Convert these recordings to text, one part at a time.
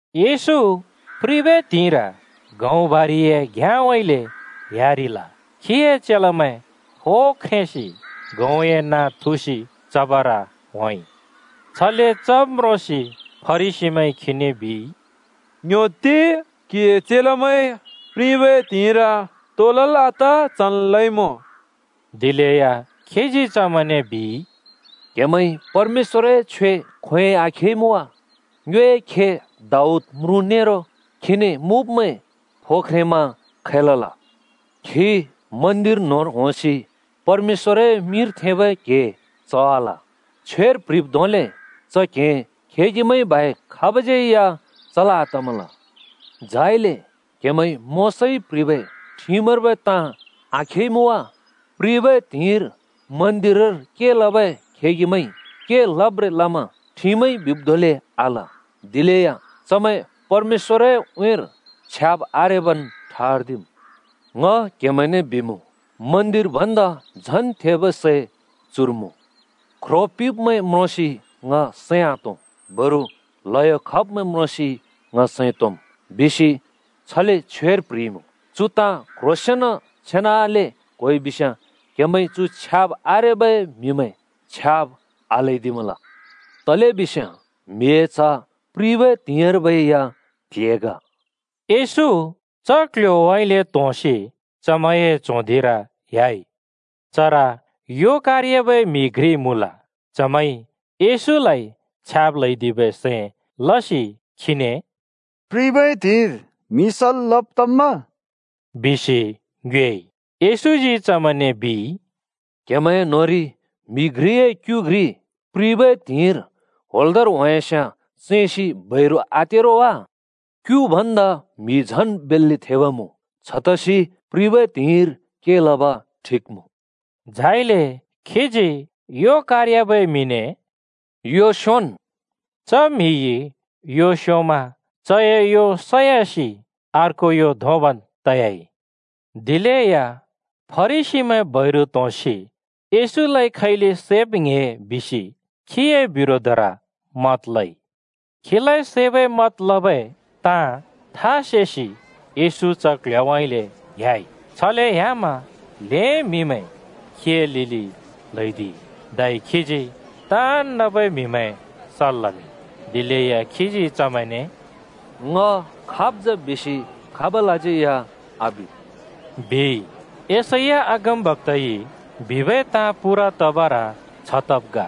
येशू प्रिबै त्हिंइर गहुँ बारिए घ्याँउँइँले ह्‍यारिल। खीए चेलामैं फो ख्रेंसि गहुँए नाँ थुसि चबर होंइ। छले चब् म्रोंसि फरिसीमैंइ खीने बिइ, “ङ्‍ह्‍योत्ति, क्‍हिए चेलामैंइ प्रिबै त्हिंइर तो लल् आत चन् लइमुँ।” दिलेया खीजी चमैंने बिइ, “क्‍हेमैंइ परमेश्‍वरए छ्वे खोंयोंइ आखेइमुँ वा? ङ्योए खे दाऊद म्रुँ नेरो खीने मुँब्मैं फो ख्रेंमा खै लल? खी मन्दिर न्होंर होंसि परमेश्‍वरए मिंर थेंबै क्हें चवाल। छ्वेर प्ह्रिब् धोंले च क्‍हें खेगिमैंइ बाहेक खाबज्यै या चल् आतमल। झाइले क्‍हेमैंइ मोशाइ प्ह्रिबै ठिमर्बै ताँ आखेइमुँ वा? प्रिबै त्हिंइर मन्दिरर के लबै खेगिमैंइ के लब्रें लमा ठिमइ बिब् धोंले आल। दिलेया चमैं परमेश्‍वएर उँइँर छ्याब् आरेबन् ठर्दिम्। ङ क्‍हेमैंने बिमुँ, मन्दिर भन्दा झन् थेबै सै चुर मुँ। ‘ख्रो पिंब्‍मैं म्रोंसि ङ सैं आतों बरु ल्हयो खब्मैं म्रोंसि ङ सैं तोंम्,’ बिसि छले छ्वेर प्‍ह्रिइमुँ। चु ताँ क्‍ह्रोंसेंन छेनाले क्‍होइबिस्‍याँ क्‍हेमैंइ चु छ्याब् आरेबै म्‍हिमैं छ्याब् आल्‍हैदिमल। तलेबिस्याँ ‘म्‍हिए च्‍ह’ प्रिबै त्हिंइर्बै या क्‍ल्‍हे ग।” येशू च क्‍ल्‍ह्‍योउँइँले त्होंसि चमैंए च्हों धिंर ह्‍याइ। चर यो कार‍याबै म्‍हि घ्रि मुँल। चमैंइ येशूलाइ छ्याब् ल्‍हैदिबै सैं लसि खीने “प्रिबै त्हिंइर म्‍हि सल् लब तम्मा?” बिसि ङ्योएइ। येशूजी चमैंने बिइ, “क्‍हेमैं न्‍होंरि म्‍हि घ्रिए क्‍यु घ्रि प्रिबै त्हिंइर होंल्‍दोंर होंयास्याँ चैंसि बैरु आते रो वा? क्‍यु भन्दा म्‍हि झन् बेल्‍ले थेब मुँ! छतसि प्रिबै त्हिंइर के लब ठिक मुँ।” झाइले खीजी यो कारयाबै म्हिने “यो स्‍योंन् बिइ।” च म्‍हिइ यो स्‍योंमा च यो सयासि अर्को यो धोंबन् त‍याइ। दिलेया फरिसीमैं बैरु त्‍होंसि येशूलाइ खैले सैब् ङ्‍हे बिसि खीए बिरोधर मत लइ। खीलाइ सैबै मत लबै ताँ था सेसि येशू च क्ल्ह्‍योउँइँले ह्‍याइ। छले ह्‍यामा ल्‍हें म्‍हिमैं खीए लिलि ल्‍हौदिइ, धै खीजी ताँन् नबै म्‍हिमैं सल् लमिंइ। दिलेया खीजी चमैंने “ङ खाब् जा बिसि खाबलसज्यै आबिद्,” बिइ। यशैया अगमबक्‍ताइ बिबै ताँ पूरा तबर छ तब् ग: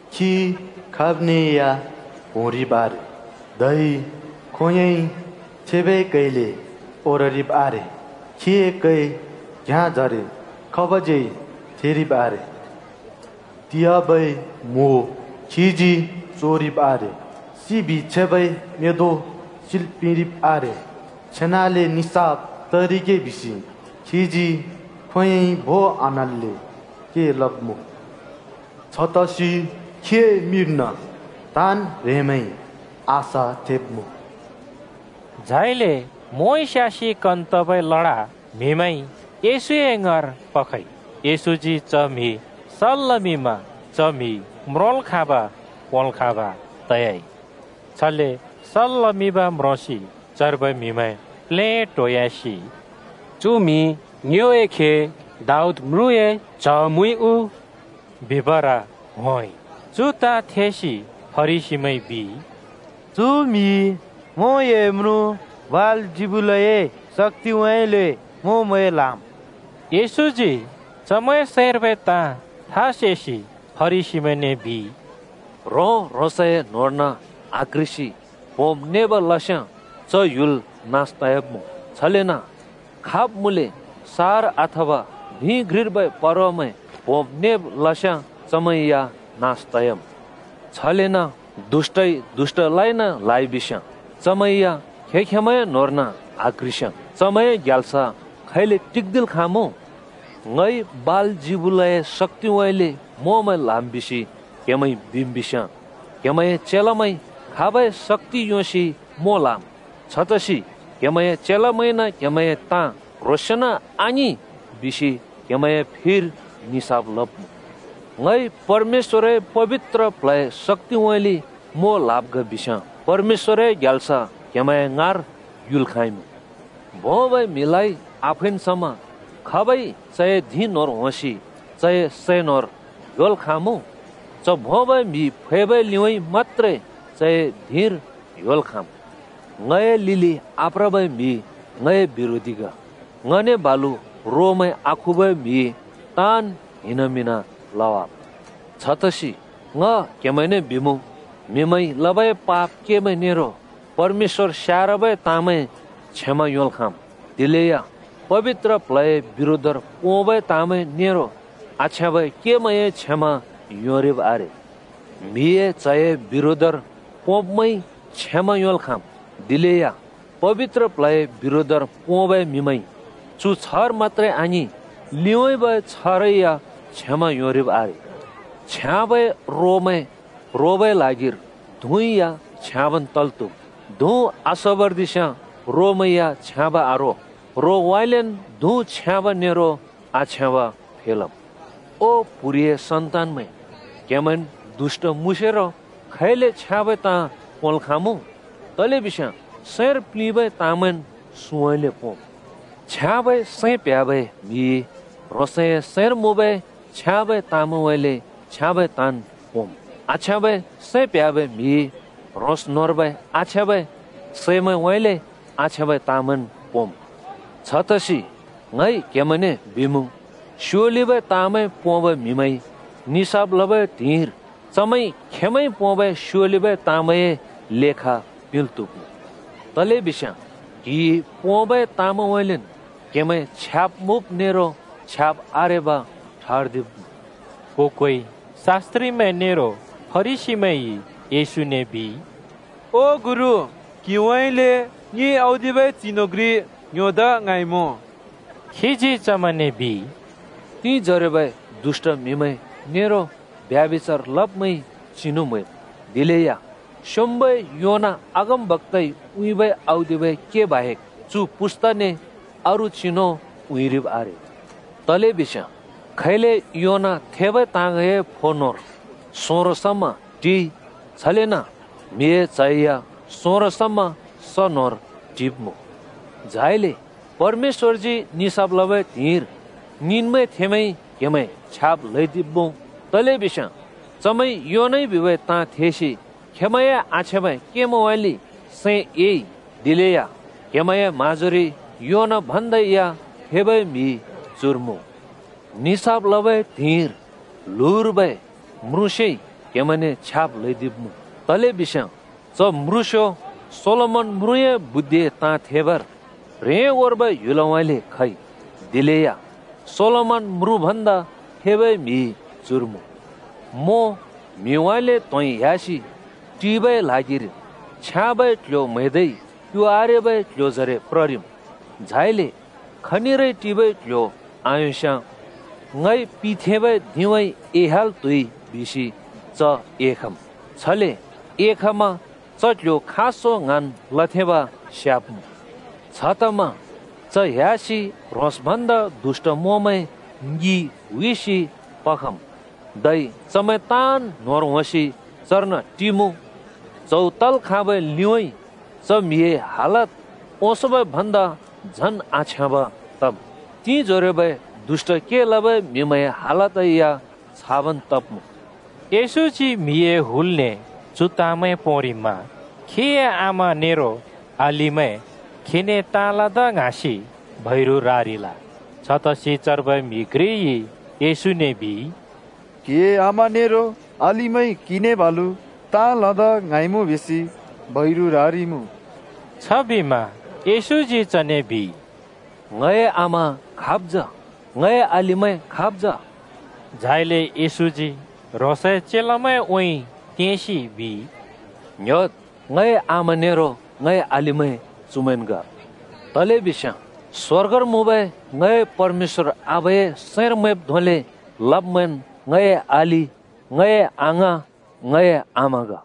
खी खाब्ने या प्होंरिब् आरे, धै खोंयोंइ थेबै कैले ओररिब् आरे। खीए कै घ्‍याँजरे खाबज्यै थेरिब् आरे। तियाबै म्वो खीजी चोरिब् आरे सिबि छेबै मेंदों सिल् पिंरिब् आरे। छेनाले निसाफ तरिगे बिसि खीजी खोंयोंइ भों आन्‍हल्‍ले के लब्‍मुँ। छतसि खीए मिंर्न ताँन् ह्रेंमैंइ आशा थेंब्‍मुँ।” झाइले मोंइ स्‍यासि कन तबै लडा म्‍हिमैंइ येशूए ङाँर पखइ। येशूजी च म्‍हि सल् लमिंमा च म्‍हि म्रोंल् खाँब, पोंल् खाँब् त‍याइ। छले सल् लमिंब् म्रोंसि चर्बै म्‍हिमैं प्लेटोयासि “चु म्‍हि ङ्योए खे दाऊद म्रुँए च्ह मुइ उ?” बिबर होंइ। चु ताँ थेसि फरिसीमैंइ बिइ, “चु म्हिइ मोंए म्रुँ बालजिबुलए शक्‍तिउँइँले मोंमैं ल्‍हाम्।” येशूजी चमैंए सैंर्बै ताँ था सेसि फरिसीमैंने बिइ, “ह्रों-ह्रोंसए न्होंर्न आक्ह्रिसि प्होंब्-नेब् लस्याँ च ह्‍युल नास त‍याब्‍मुँ। छलेन खाब् मुँले सहर अथवा धिं घ्रिर्बै परवामैं प्होंब् नेब् लस्याँ चमैं या नास तयाम्।” छलेन दुष्‍टइ दुष्‍टलाइन ल्‍हाइबिस्‍याँ चमैं या खें-खेंमैए न्होंर्न आक्ह्रिस्याँ चमैंए ग्याल्स खैले टिक्दिल् खाँमुँ? ङइ बालजिबुलए शक्‍तिउँइँले मोंमैं ल्‍हाम् बिसि क्हेमैंइ बिम् बिस्याँ, क्‍हेमैंए चेलामैंइ खाबै शक्‍ति योंसि मों ल्‍हाम्? छतसि क्हेमैंए चेलामैंइन क्हेमैंए ताँ क्ह्रोंसेंन् आङिं बिसि क्हेमैंए फिर निसाफ लब्मुँ। ङइ परमेश्‍वरए पबित्र प्ल्हए शक्‍तिउँइँले मों ल्‍हाब् ग बिस्याँ परमेश्‍वरए ग्याल्स क्‍हेमैंए ङाँर युल् खाँइमुँ। “भोंबै म्‍हिलाइ आफैन् समा खाबइ चए धिं न्होंर होंसि चए सै न्होर ह्‍योल् खाँमुँ? च भोंबै म्हि फैबै लिउँइँ मत्‍त्रे चए धिंर ह्‍योल् खाँम्। “ङए लिलि आप्रबै म्‍हि ङए बिरोधी ग, ङने बालु रोमैं आखुबै म्हिइ ताँन् हिनामिंना लवाम्। छतसि ङ क्हेमैंने बिमुँ, म्हिमैंइ लबै पाप केमैं नेरो परमेश्‍वर स्यारबै ताँमैं क्षमा योंल् खाँम्, दिलेया पबित्र प्ल्हए बिरोधर पोंबै ताँमैं नेरो आछ्याँबै केमैंए क्षमा योंरिब् आरे। ‘म्हिए च्‍हए’ बिरोधर पोंब्मैंइ क्षमा योंल् खाँम्। दिलेया पबित्र प्ल्हए बिरोधर पोंबै म्‍हिमैंइ चु छ्हर मत्‍त्रे आङिं लिउँइँबै छ्‍हरै या क्षमा योंरिब् आरे। “छ्याँबै रोमैं रोबै ल्हागिर धुँ या छ्याँबन् तल् त्हुम्, धुँ आसोबर्दिस्‍याँ रोमैं या छ्याँब आरो। रोउँइँलेन् धुँ छ्याँब नेरो आछ्याँब फेलम्। ओ प्‍हुरिए सन्‍तानमैं! क्‍हेमैंन् दुष्‍ट मुँसेरो खैले छ्याँबै ताँ पोंल् खाँमुँ? तलेबिस्याँ सैंर प्लिंबै ताँमैंन् सुँउँइँले पोंम्। छ्याँबै सैं प्ह्‍याबै म्हिइ ह्रोंसए सैंर मुँबै छ्याँबै ताँमैंउँइँले छ्याँबै ताँन् पोंमुँ। आछ्याँबै सैं प्ह्‍याबै म्‍हिइ ह्रोंस् न्‍होंर्बै आछ्याँबै सैमैंउँइँले आछ्याँबै ताँमैंन् पोंम्। “छतसि ङ क्हेमैंने बिमुँ, स्योलिबै ताँमैं पोंबै म्हिमैंइ निसाफ लबै त्हिंइर चमैंइ खेंमैंइ पोंबै स्योलिबै ताँमैंए लेखा पिंल् त्‍हुब्मुँ। तलेबिस्याँ क्‍हिइ पोंबै ताँमैंउँइँलेन् क्हेमैं छ्याब् मुँब नेरो छ्याब् आरेब ठर्दिब्मुँ।” को-कोइ शास्‍त्रिमैं नेरो फरिसीमैंइ येशूने बिइ, “ओ गुरु, क्हिउँइँले ङि औदिबै चिनु घ्रि ङ्‍ह्‍योदा ङ्हाँइमुँ।” खीजी चमैंने बिइ, “तिंजोरोबै दुष्‍ट म्‍हिमैं नेरो ब्यभिचार लब्मैंइ चिनु म्हैम्। दिलेया स्‍योंम्‍बै योना अगमबक्‍ताइ उँइँबै औदिबै के बाहेक चु पुस्ताने अरू चिनु उँइँरिब् आरे। तलेबिस्याँ खैले योना थेबै ताँगए फो न्‍होंर सोंरो समा टिइ, छलेन म्हिए च्ह या सोंरो समा स न्होंर टिब्‍मुँ। झाइले परमेश्‍वरजी निसाफ लबै त्हिंइर निनवेथेंमैंइ क्‍हेमैं छ्याब् ल्‍हैदिब्‍मुँ। तलेबिस्याँ चमैंइ योनाइ बिबै ताँ थेसि खेमैंए आछ्याँबै केमैंउँइँले सैं एइ, दिलेया क्‍हेमैंए म्‍हाँजोरि योना भन्दा या थेबै म्‍हि चुर मुँ! निसाफ लबै त्हिंइर ल्हुँर्बै (दक्षिणर्बै) म्रुँस्‍योइ क्‍हेमैंने छ्याब् ल्‍हैदिब्‍मुँ। तलेबिस्याँ च म्रुँस्‍यो सोलोमन म्रुँए बुद्धिए ताँ थेबर ह्रेंगोर्बै ह्‍युलउँइँले खइ। दिलेया सोलोमन म्रुँ भन्दा थेबै म्‍हि चुर मुँ! “मों म्‍हिउँइँले त्‍होंइ ह्‍यासि टिबै ल्हागिर छ्याँबै क्ल्ह्‍यो म्‍हैदै क्यु आरेबै क्ल्ह्‍योजरे प्ररिम्। झाइले खनिरै टिबै क्‍ल्‍ह्‍यो आयोंस्‍याँ ‘ङइ पिथेंबै धिंउँइँ एह्‍याल् त्हुइ’ बिसि च एखम्। छले एखमा च क्‍ल्‍ह्‍यो खाँसों ङ्हाँन् लथेंब स्याब्मुँ। छतमा च ह्‍यासि ह्रोंस् भन्दा दुष्‍ट मोंमैं ङि हुइसि पखम्। धै चमैं ताँन् न्‍होंर होंसि चर्न टिमुँ च्‍हौ तल् खाँबै लिउँइँ च म्‍हिए हालत ओंसोंबै भन्दा झन् आछ्याँब तम्। तिंजोरोबै दुष्‍ट के लबै म्‍हिमैंए हालत या छाबन् तब्‍मुँ।” येशूजी म्‍हिए हुलने चु ताँमैं पोंरिमा खीए आमा नेरो अलिमैं खीने ताँ लदा ङ्हाँसि बैरु रारिल। छतसि चर्बै म्‍हि घ्रिइ येशूने बिइ, “क्‍हिए आमा नेरो अलिमैं क्‍हिने बालु ताँ लदा ङ्हाँइमुँ बिसि बैरु रारिइमुँ।” छबिमा येशूजी चने बिइ, “ङए आमा खाब् जा? ङए अलिमैं खाब् जा?” झाइले येशूजी ह्रोंसए चेलामैंउँइँ तेंसि बिइ। “ङ्‍ह्‍योद्, ङए आमा नेरो अलिमैं चुमैंन् ग। तलेबिस्याँ स्वर्गर मुँबै ङए परमेश्‍वर आबाए सैंर मैंब् धोंले लब्मैंन् ङए अलि, ङए अङाँ, ङए आमा ग।”